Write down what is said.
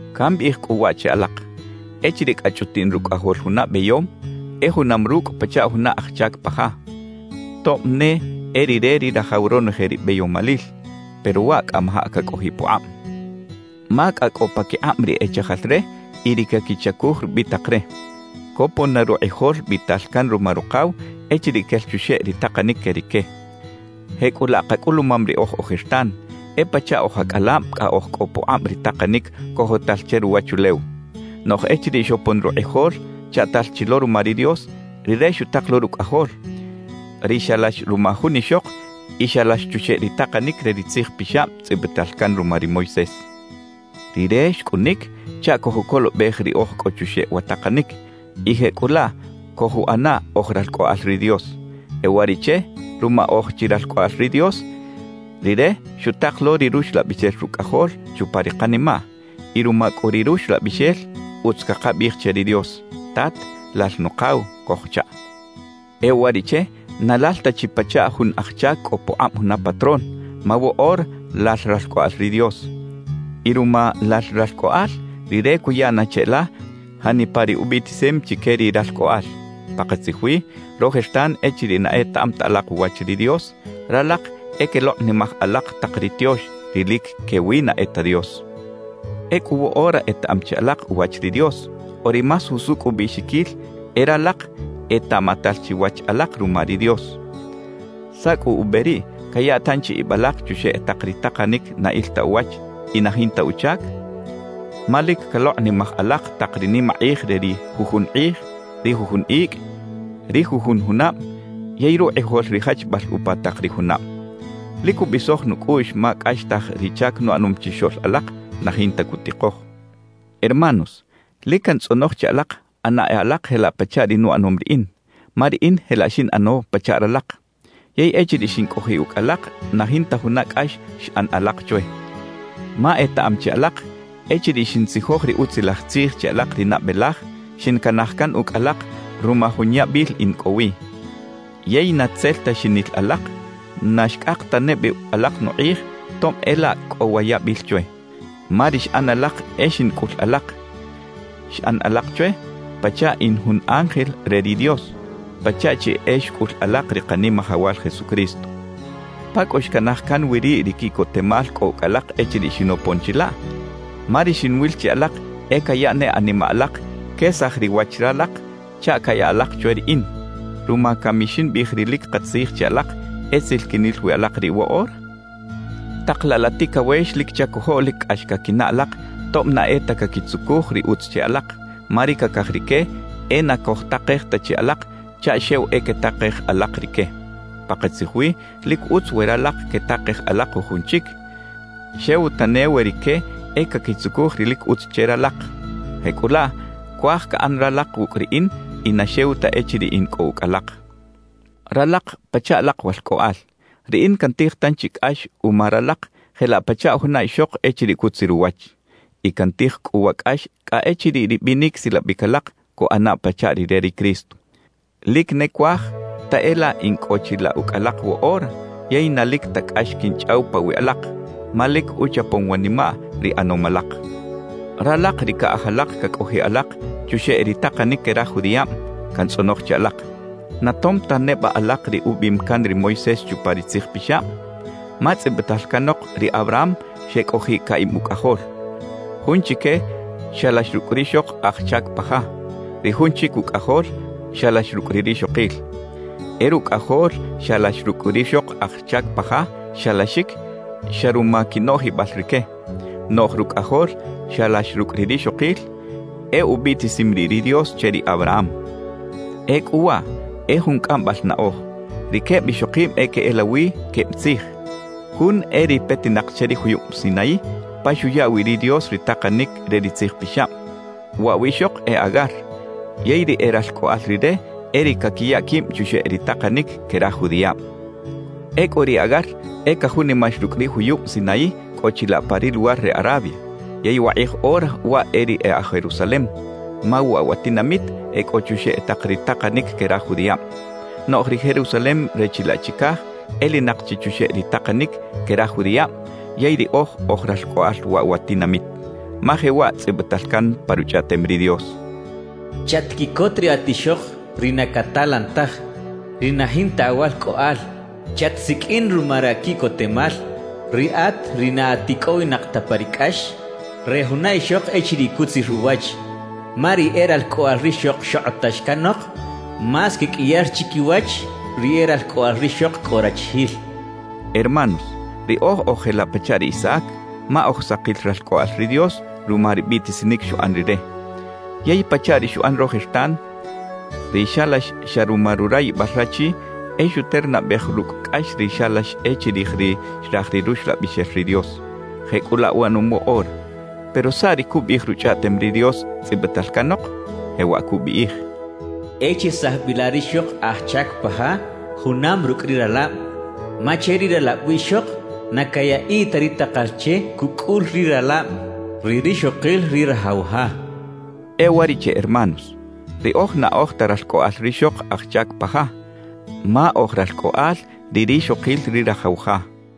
Cambiꞌij cꞌu waꞌ che alak: Echiriꞌ cꞌa chꞌutiꞌn rucꞌajol juna beyom, e junam rucꞌ pachaꞌ juna aj chac pa ja. Tob ne e rire ri rajaw ronoje ri beyomalil, pero waꞌ cꞌamajaꞌ cacꞌojiꞌ pukꞌab ma cꞌa cꞌo paquikꞌab ri e chajal re y ri caquichacuj rubitak re, copon na rukꞌijol biꞌtal can ruma rukaw echiriꞌ quel chuxeꞌ ri takanic que rique. Jecꞌulaꞌ kacꞌulumam riꞌoj ojertan, e pachaꞌ oj acꞌalab cꞌa oj cꞌo pukꞌab ri takanic cojotal che ruwachulew. Noꞌj echiriꞌ xopon rukꞌijol chaꞌtal chi lo ruma ri Dios, Rire xutak lo Rucꞌajol, ri xalax ruma jun ixok y xalax chuxeꞌ ri takanic re ri Tzij Pixab tzꞌibital can ruma ri Moisés. Rire xcꞌunic chaꞌ cojucolobej ri oj cꞌo chuxeꞌ wa takanic, y jecꞌulaꞌ cojuꞌana oj ralcꞌoꞌal ri Dios. E uwariꞌche, ruma oj chi ralcꞌoꞌal ri Dios, Rire xutak lo ri Ruxlabixel Rucꞌajol chupa ri kanimaꞌ; y ruma cꞌu ri Ruxlabixel, utz cakabiꞌij che ri Dios: «¡Tat, Lal Nukaw!» cojchaꞌ. E uwariꞌche na lal ta chi pachaꞌ jun aj chac cꞌo pukꞌab juna patrón, ma woꞌora lal ralcꞌoꞌal ri Dios. Y ruma lal ralcꞌoꞌal, Rire cuya na cheꞌla janipa ri ubiꞌtisim chique ri ralcꞌoꞌal. Pakatzij wi, rojertan echiriꞌ na etaꞌam ta alak uwach ri Dios, ralak e quelokꞌnimaj alak tak ri tiox, ri lic quewi na e ta dios. Ecꞌu woꞌora etaꞌam chi alak uwach ri Dios, o ri más jusucꞌ ubiꞌxiquil e “ralak etaꞌmatal chi wach alak ruma ri Dios”. ¿Saꞌ cꞌu ube riꞌ caya tanchi ib alak chuxeꞌ tak ri takanic na il ta uwach y na jinta uchac? Ma lic calokꞌnimaj alak tak ri nimakꞌij re ri jujun kꞌij, ri jujun icꞌ, ri jujun junab yey rukꞌijol ri jachbal upa tak ri junab. Lic cubisoj nucꞌuꞌx ma cꞌaxtaj ri chac nuꞌanom chixoꞌl alak na jinta cutikoj. Hermanos, lic cantzꞌonoj che alak ꞌana e alak jelaꞌ pachaꞌ ri nuꞌanom riꞌin, ma riꞌin jelaꞌ xinꞌano pachaꞌ ralak. Yey echiriꞌ xincꞌojiꞌ ucꞌ alak na jinta juna cꞌax xꞌan alak chwe. Ma etaꞌam chi alak, echiriꞌ xintzijoj ri Utzilaj Tzij che alak ri nabe laj, xincanaj can ucꞌ alak ruma jun yabil in cꞌo wi. Yey na tzel ta xinil alak, na xcꞌak tane bi alak nukꞌij tob e laꞌ cꞌo wa yabil chwe. Ma ri xꞌan alak e xincꞌul alak, xꞌan alak chwe pachaꞌ in jun ángel re ri Dios, pachaꞌ chi e xcꞌul alak ri Kanimajawal Jesucristo. ¿Pa cꞌu xcanaj can wi riꞌ ri quiꞌcotemal cꞌo ucꞌ alak echiriꞌ xinopon chilaꞌ? Ma ri xinwil che alak e caya ne animaꞌ alak quesaj ri wach ralak chaꞌ caya alak chwe riꞌin. ¿Ruma cami ximbiꞌij ri lic katzij che alak, e tzel quinil wi alak riꞌ woꞌora? Tak laꞌ la ticawex lic chacojoꞌ lic cꞌax caquinaꞌ alak tob na e ta caquitzucuj ri utz che alak, ma ri cacaj rique e na cojtakej ta chi alak chaꞌ xew e quetakej alak rique. Pakatzij wi lic utz we ralak quetakej alak jujun chic, xew tane we rique e caquitzucuj ri lic utz che ralak. Jecꞌulaꞌ cuaj caꞌan ralak wucꞌ riꞌin y na xew ta echiriꞌ in cꞌo ucꞌ alak. Ralak pachaꞌ alak walcꞌoꞌal, riꞌin cantij tanchi cꞌax uma ralak jelaꞌ pachaꞌ juna ixok echiriꞌ cutzir uwach. Y cantij cꞌu wa cꞌax cꞌa echiriꞌ ri binic silabic alak cuꞌana pachaꞌ ri re ri Cristo. Lic ne cuaj ta e laꞌ in cꞌo chilaꞌ ucꞌ alak woꞌora yey na lic ta cꞌax quinchꞌaw pawiꞌ alak, ma lic uchapom wanimaꞌ ri ꞌanom alak. Ralak ri caꞌaj alak cacꞌojiꞌ alak chuxeꞌ ri takanic que raj judiꞌab, cantzꞌonoj che alak: ¿Na tom ta neba alak ri ubiꞌim can ri Moisés chupa ri Tzij Pixab? Ma tzꞌibital canok ri Abraham xecꞌojiꞌ caꞌib ucꞌajol. Jun chique xalax rucꞌ rixok aj chac pa ja; ri jun chic ucꞌajol xalax rucꞌ ri rixokil. E rucꞌajol xalax rucꞌ rixok aj chac pa ja, xalaxic xa ruma quinoꞌjibal rique; noꞌj rucꞌajol xalax rucꞌ ri rixokil, e ubiꞌtisim riꞌ ri Dios che ri Abraham. Ecꞌu waꞌ e jun cꞌambal naꞌoj. Ri queb ixokib e queꞌelawi queb tzij; jun e ri petinak che ri juyub Sinaí pa xuya wi ri Dios ri takanic re ri Tzij Pixab. Waꞌ wiꞌxok e Agar, yey ri e ralcꞌoꞌal rire e ri caquiya quib chuxeꞌ ri takanic que raj judiꞌab. Ecꞌu ri Agar e cajunimax rucꞌ ri juyub Sinaí cꞌo chilaꞌ pa ri luwar re Arabia; yey wakꞌij ora waꞌ e ri e aj Jerusalem, ma waꞌ wa tinamit e cꞌo chuxeꞌ tak ri takanic que raj judiꞌab. Noꞌj ri “Jerusalem” re chilaꞌ chicaj elinak chi chuxeꞌ ri takanic que raj judiꞌab yey riꞌoj oj ralcꞌoꞌal waꞌ wa tinamit. Ma jewaꞌ tzꞌibital can pa Ruchꞌaꞌtem ri Dios: ¡Chatquiꞌcot riꞌat ixok ri na catalan taj, ri na jinta awalcꞌoꞌal! ¡Chatsiqꞌuin ruma raquiꞌcotemal, riꞌat ri na at icꞌowinak ta pa ri cꞌax re juna ixok echiriꞌ cutzir uwach! Ma ri e ralcꞌoꞌal rixok xokꞌotax canok, más queqꞌuiyar chiquiwach ri e ralcꞌoꞌal rixok cꞌo rachijil cachaꞌ. Hermanos, riꞌoj oj jelaꞌ pachaꞌ ri Isaac, ma oj sakil ralcꞌoꞌal ri Dios ruma ri biꞌtisinic xuꞌan Rire. Yey pachaꞌ ri xuꞌan rojertan, ri xalax xa ruma rurayibal rachi e xuternabej rucꞌ cꞌax ri xalax e chirij ri xraj ri Ruxlabixel ri Dios; jecꞌulaꞌ uꞌanom woꞌora. Pero ¿saꞌ ri cubiꞌij Ruchꞌaꞌtem ri Dios tzꞌibital canok? Jewaꞌ cubiꞌij: E chesaj bi la rixok aj chac pa ja junam rucꞌ ri ralab. Ma che ri ralab wiꞌxok na cayaꞌiꞌ ta ri takal che cucꞌul ri ralab ri rixokil ri rajaw ja cachaꞌ. E uwariꞌche hermanos, riꞌoj na oj ta ralcꞌoꞌal rixok aj chac pa ja, ma oj ralcꞌoꞌal ri rixokil ri rajaw ja.